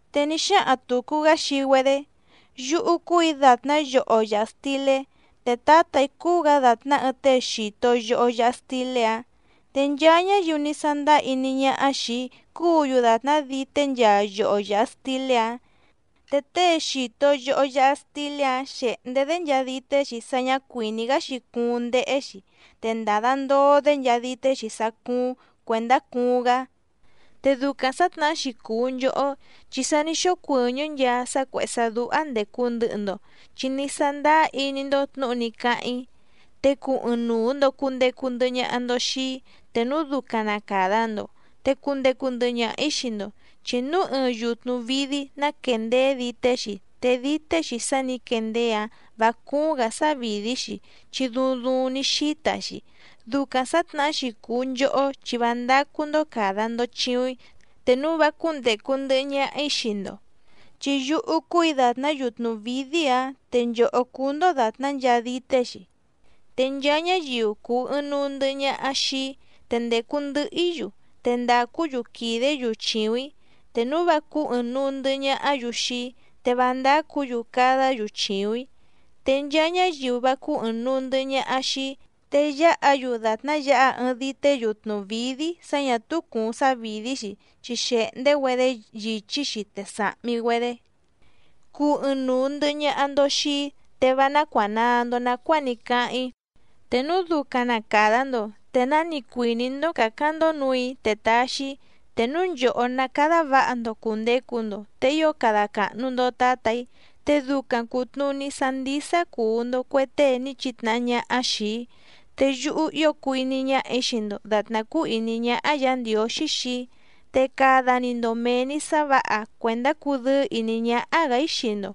Te ní xáhaⁿ tùcu‑gá xii‑güedé: —Yúhú cúù‑í dàtná yoho yàha stilé, te Tǎtà‑í cúú‑gǎ dàtná ɨɨⁿ tée xìto yoho yaha stilé‑áⁿ. Te nchaa ñáyiu ní sándáá iní ñáhá xìi‑í cúǔ‑yu dàtná dité nchaa yoho yàha stilé‑áⁿ. Te tée xìto yoho yaha stilé‑áⁿ xèhndé‑dé nchaa dité‑xi sá ñǎ cuìní‑gá‑xi cuuⁿ ndéhé‑xi, te ndàda ndoo‑dé nchaa dité‑xi sá cúúⁿ cuèndá cuuⁿ‑gá. Te ducaⁿ sǎtnahá‑xi cùu nchohó, chi sa ní xócuɨ̀ñɨ́ nchaa sá cuèhé sá dúhá ndècu ndɨhɨ‑ndo, chi ní sándáá iní‑ndó tnǔhu ní cáháⁿ‑í. Te cuu ɨɨⁿnuu‑ndo cùndecu ndɨhɨ ñaha‑ndo xii‑í, te núu ducaⁿ na càda‑ndo, te cundecu ndɨhɨ ñaha‑ǐ xii‑ndo. Chi núu ɨɨⁿ yutnu vǐdí ná quéndèé dité‑xi, te dité‑xi sá nǐ quendeé‑áⁿ vǎ cúúⁿ‑gǎ sávìdí‑xi chi duuⁿ duuⁿ ní xíta‑xi. Ducaⁿ sǎtnahá‑xi cùu nchohó chi vá ndácú‑ndó càda‑ndo chiuⁿ‑í, te núu vá cúndècu ndɨhɨ ñaha‑í xii‑ndo. ’Chi yúhú cúù‑í dàtná yutnu vǐdí‑áⁿ, te nchòhó cúú‑ndó dàtná nchaa dité‑xi. Te nchaa ñáyiu cùu ɨɨⁿnuu ndɨhɨ ñaha xii‑í, te ndècu ndɨhɨ‑í‑yu, te ndàcú‑yu quìdé‑yu chìuⁿ‑í. Te núu vá cúú ɨ̀ɨⁿnuu ndɨhɨ ñahá‑yu xii‑í, te vá ndácǔ‑yu cadá‑yu chìuⁿ‑í. Te nchaa ñáyiu vá cúú ɨ̀ɨⁿnuu ndɨhɨ ñaha xii‑í, te yáha‑yu dàtná yǎha ɨɨⁿ dité yutnu vǐdí sá ñà túú cùuⁿ sávìdí‑xi, chi xèhndé‑güedé yìchí‑xi, te sàhmi‑güedé. ’Cuu ɨɨⁿnuu ndɨ̀hɨ ñaha‑ndo xii‑í, te vá nácuànaa‑ndo nacuáa ní cáháⁿ‑í. Te núu ducaⁿ na càda‑ndo, te náni cuìní‑ndó cǎcáⁿ‑ndó nǔù‑í te taxi‑í. Te núu nchòhó ná cádá vǎha‑ndo cùndecu‑ndo, te ío cada càhnu‑ndo Tátà‑í, te ducaⁿ cùtnuní sá ndísá cùu‑ndo cue tée ní chitnahá ñáhá xìi‑í. Te yúhú ío cùu iní ñáhà‑í xii‑ndo dàtná cúú ìní ñáhá Yǎ Ndiǒxí xii‑í. Te cada‑ni‑ndo mèe‑ni sá vǎha cuèndá cudɨ́ɨ́ ìní ñáhá‑gǎ‑í xii‑ndo.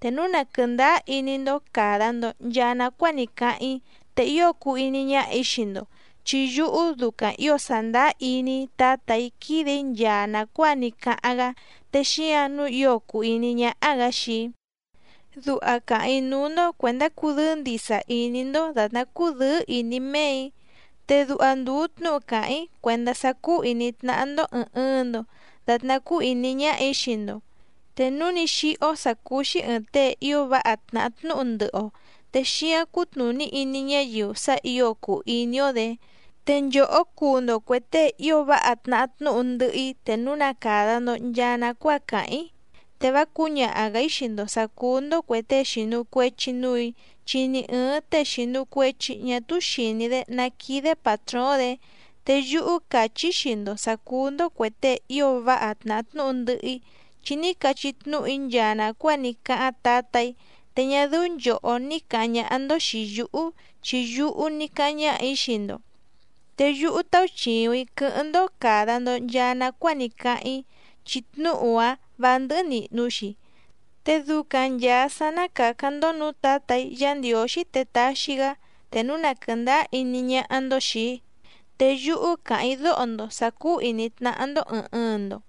Te núu na quɨ̀ndáá iní‑ndó càda‑ndo nchaa nacuáa ní cáháⁿ‑í, te ío cuu iní ñáhà‑í xii‑ndo, chi yúhú ducaⁿ ǐo sàndáá iní‑í Tǎtà‑í quídè‑í nchaa nàcuáa ní cáháⁿ‑gá, te xíǎⁿ nǔu ío cùu iní ñáhá‑gǎ xii‑í. ’Duha càháⁿ‑í núú‑ndó cuèndá cudɨ́ɨ́ ndìsa iní‑ndó dàtná cúdɨ̌ɨ́ ìní méè‑í. Te duha ndùu tnúhu càháⁿ‑í cuèndá sá cúú ìní tnáhá‑ndó ɨ̀ɨⁿ ɨɨⁿ‑ndo datná cúú ìní ñáhà‑í xii‑ndo. Te núu ní xíhó sǎ cúú‑xí ɨ̀ɨⁿ tée ío váha tnàhá tnúhu ndɨhɨ‑o, te xíǎⁿ cutnùní iní ñáyiu sá ǐo cùu iní‑ó‑dě. Te nchòhó cuu‑ndo cuè tée ío váha tnahá tnúhu ndɨhɨ‑í te núu na càda‑ndo nchaa nacuáa càháⁿ‑í. Te vá cǔñaha‑gǎ‑í xii‑ndo sǎ cúú‑ndó cuè tée xìnu cuechi núù‑í, chi ni ɨ̀ɨⁿ tée xìnu cuechi ñá túú xìní‑dé ná quídé pàtróóⁿ‑dě. Te yúhú càchí‑í xii‑ndo sǎ cúú‑ndó cuè tée ío váha tnàhá tnúhu ndɨhɨ‑í, chi ní cachí tnúhu‑í nchaa nàcuáa ní cáháⁿ Tǎtà‑í. Te ñá dɨ́ú nchòhó ní càháⁿ ñáhá‑ndó xìi yúhú, chi yúhú ní cáháⁿ ñáhà‑í xii‑ndo. Te yúhú tauchìuⁿ‑í quɨ́hɨ́ⁿ‑ndó càda‑ndo nchaa nacuáa ní cáháⁿ‑í, chi tnúhu‑áⁿ vǎ ndɨ́hɨ́ nìhnu‑xi. Te ducaⁿ nchàa sá ná càcáⁿ‑ndó nǔú Tǎtà‑í Yǎ Ndiǒxí te taxi‑gá, te núu na quɨ̀ndáá iní ñáhá‑ndó xìi‑í. Te yúhú càháⁿ‑í dóho‑ndo sǎ cúú ìní tnáhá‑ndó ɨ̀ɨⁿ ɨɨⁿ‑ndo.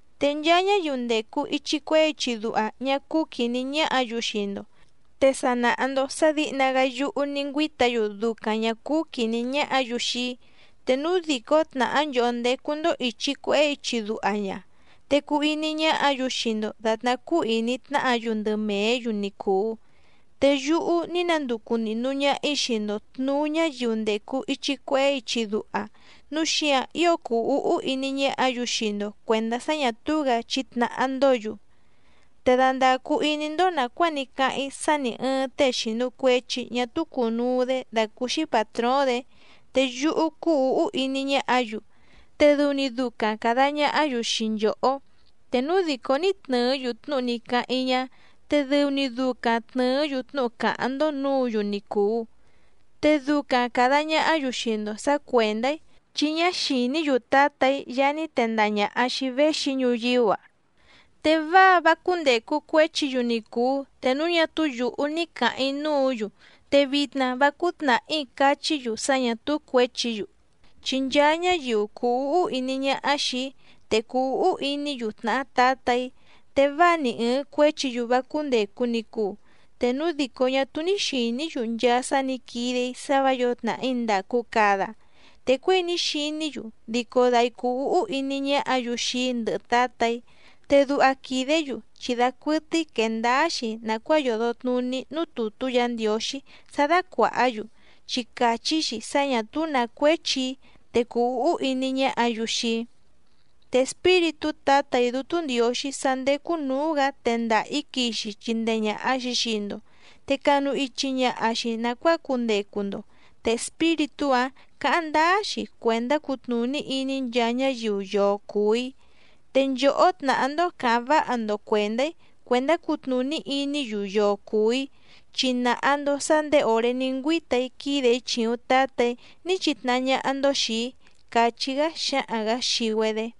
’Te nchaa ñáyiu ndècu ichi cuehé ichi duha ñá cúú quìní ñáhǎ‑yu xii‑ndo, te sa nàha‑ndo sá dǐhna‑gá yúhú ní ngüíta‑yu ducaⁿ ñà cúú quìní ñáhǎ‑yu xii‑í. Te núu dìcó tnàhá nchòhó ndécú‑ndó ìchi cuehé ichi duha ña, te cuu iní ñáhǎ‑yu xii‑ndo dàtná cúú ìní tnáhǎ‑yu ndɨ mèé‑yu ni cùu. Te yúhú ní nanducu nìhnu ñaha‑í xii‑ndo tnùú ñáyiu ndècu ichi cuehé ichi duha, núu xíǎⁿ ío cùu úhú iní ñáhǎ‑yu xii‑ndo cuèndá sá ñà túú‑gǎ chítnàhá‑ndǒ‑yu. Te dandàcu iní‑ndó nàcuáa ní cáháⁿ‑í sá nì ɨɨⁿ tée xìnu cuechi ñá túú cùnuu‑dé dàcúúxí pàtróóⁿ‑dě. Te yúhú cúú ǔhú iní ñáhǎ‑yu, te dɨu‑ni ducaⁿ càda ñahá‑yu xii nchòhó. Te núu dìcó ní tnɨ̀ɨ́‑yu tnúhu ní cáháⁿ‑í ñá, te dɨu‑ni ducaⁿ tnɨ̀ɨ́‑yu tnúhu cáháⁿ‑ndó nǔǔ‑yu ni cùu. Te ducaⁿ càda ñahá‑yu xii‑ndo sǎ cuèndá‑í, chi ñá xìní‑yu Tǎtà‑í Yaá ní tendaha ñàha xii‑í véxi‑í ñuyíú‑a. ’Te váa vá cúndècu cuéchi‑yu ni cùu, te núu ñá túú yǔhú ní cǎháⁿ‑í núǔ‑yu, te vitna vá cúú tnàhí cachí‑yu sá ñà túú cuěchi‑yu. Chi nchaa ñáyiu cùu úhú iní ñáhá xìi‑í, te cùu úhú iní‑yu tnàhá Tǎtà‑í. Te váa ni ɨ̀ɨⁿ cuéchi‑yu vá cúndècu ni cuu, te núu dìcó ñá túú ní xìní‑yu nchaa sá nǐ quide‑í sá vǎ yǒo tnàhí ndàcu cada. Te cuěi ní xiní‑yu dico dai cùu úhú iní ñáhǎ‑yu xii‑í ndɨhɨ Tǎtà‑í. Te duha quìdé‑yu chi dacuɨtɨ́í quèe ndáá‑xi nàcuáa yòdo tnuní núú tùtú Yǎ Ndiǒxí sá dácuàhá‑yu, chi càchí‑xi sá ñà túú nǎ cuéchi‑í te cuu úhú iní ñáhǎ‑yu xii‑í. ’Te Espíritú Tǎtà‑í Dútú Ndiǒxí sá ndécú nǔú‑gǎ tendaha‑ǐ quixi chindee ñàha‑xi xii‑ndo, te canu ichi ñaha‑xi nàcuáa cundecu‑ndo, te Espíritú‑áⁿ cǎháⁿ ndáá‑xi cuèndá cutnùní iní nchaa ñáyiu yoo cùu‑í. Te nchòhó tnàhá‑ndó cǎháⁿ váha‑ndo cuèndá‑í cuèndá cutnùní iní‑yu yoo cùu‑í, chi nàha‑ndo sá ndèé òré ní ngüíta‑í quídè‑í chìuⁿ Tátà‑í ní chitnahá ñáhá‑ndó xìi‑í —càchí‑gá xáhaⁿ‑gǎ xii‑güedé.